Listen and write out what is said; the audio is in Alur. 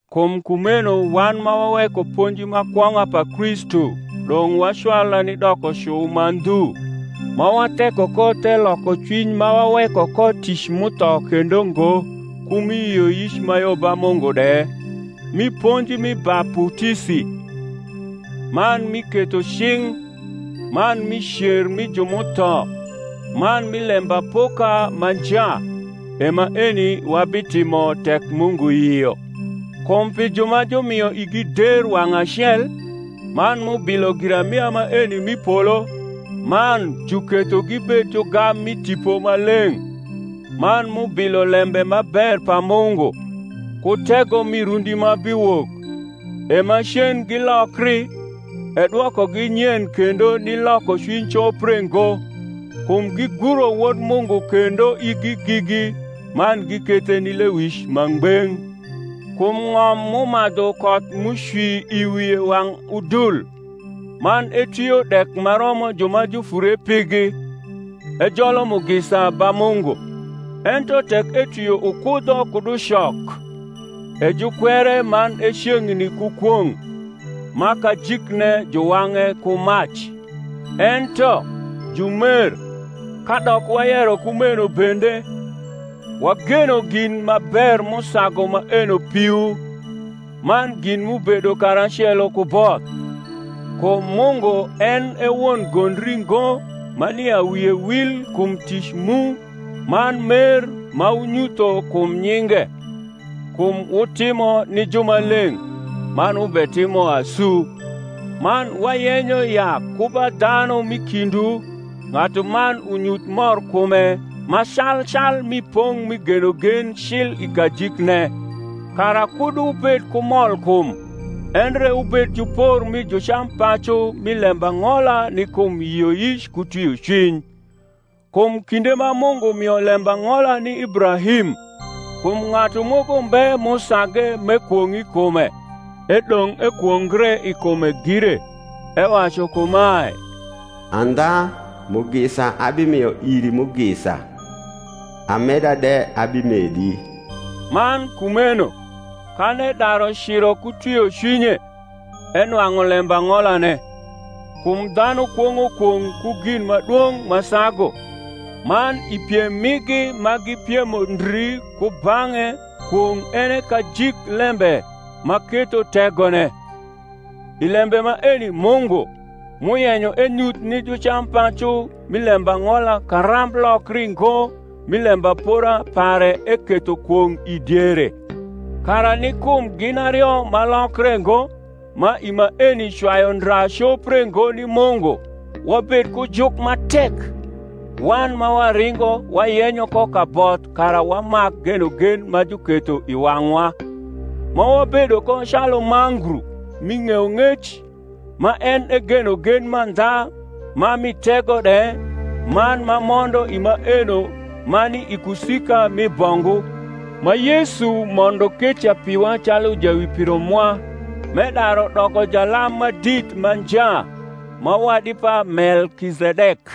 Kum kumeno wan ma waweko ponji ma kwong’a pa Kristu dong’ wacwala ni dokocu ma ndhu; ma watheko ko the lokocwiny ma waweko ko tic m’utho kendo ngo, ku mi yioyic ma yo ba Mungu de, mi ponji mi baputisi, man mi ketho cing’, man mi cer mi ju m’utho, man mi lembapoka ma nja. E maeni wabitimo, tek Mungu yio. Kum pi ju ma jumio igi der wang’ acel, man m’ubilo girarnia maeni m’i polo, man juketho gibed jugam mi Tipo Maleng’, man m’ubilo lembe ma ber pa Mungu, ku tego mi rundi ma biwok, e macen gilokri, e dwokogi nyen kendo ni lokocwiny copre ngo; kum giguro Wod Mungu kendo igi gigi, man gikethe ni lewic ma ngbeng’. Kum ng’om m’umadhu koth m’ucwi i wie wang’ udul, man etwio dek ma romo ju ma jufure pigi, ejolo mugisa ba Mungu: ento tek etwio ukudho kud ucok, e jukwere man e ceng’ni ku kwong’; ma kajikne juwang’e ku mac. Ento, jumer, kadok wayero kumeno bende, wageno gin ma ber m’usagu maeno piwu, man gin m’ubedo karacelo ku both: kum Mungu en e won gondri ngo ma nia wie wil kum tic mu man mer ma wunyutho kum nyinge, kum wutimo ni jumaleng’, man wubetimo asu. Man wayenyo ya ku ba dhanu m’i kindwu ng’atuman unyuth morkume ma calcal mi pong’ mi genogen cil i kajikne: kara kud wubed ku molkum, endre wubed jupor mi jucampacu mi lembang’ola ni kum yioyic ku twiocwiny. Kum kinde ma Mungu mio lembang’ola ni Ibrahim, kum ng’atu moko mbe m’usage m’ekwong’ i kume, edong’ ekwongre i kume gire, ewacu kumae, Andha mugisa abimio iri mugisa, ameda de abimedi. Man kumeno, kan edaru ciro ku twiocwinye, enwang’u lembang’olane. Kum dhanu kwong’o kwong’ ku gin ma dwong’ ma sagu: man i piem migi ma gipiemo ndri kubang’e kwong’ en e kajik lembe ma ketho tegone. I lembe maeni Mungu, m’uyenyo enyuth ni jucampacu mi lembang’ola karamb lokringo mi lembapora pare eketho kwong’ i diere; kara ni kum gin ario ma lokre ngo, ma i maeni cwayu ndra copre ngo ni Mungu, wabed ku juk ma tek, wan ma waringo wayenyo ko kaboth kara wamak genogen ma juketho i wang’wa; ma wabedo ko calu mangru mi ng’eyong’ec, ma en e genogen mandha ma mi tego de, man ma mondo i maeno ma ni i kusika mi bongu; ma Yesu mondo keca piwa calu jawipiro mwa, m’edaru doko jalam ma dit ma nja ma wadi pa Melkizedek.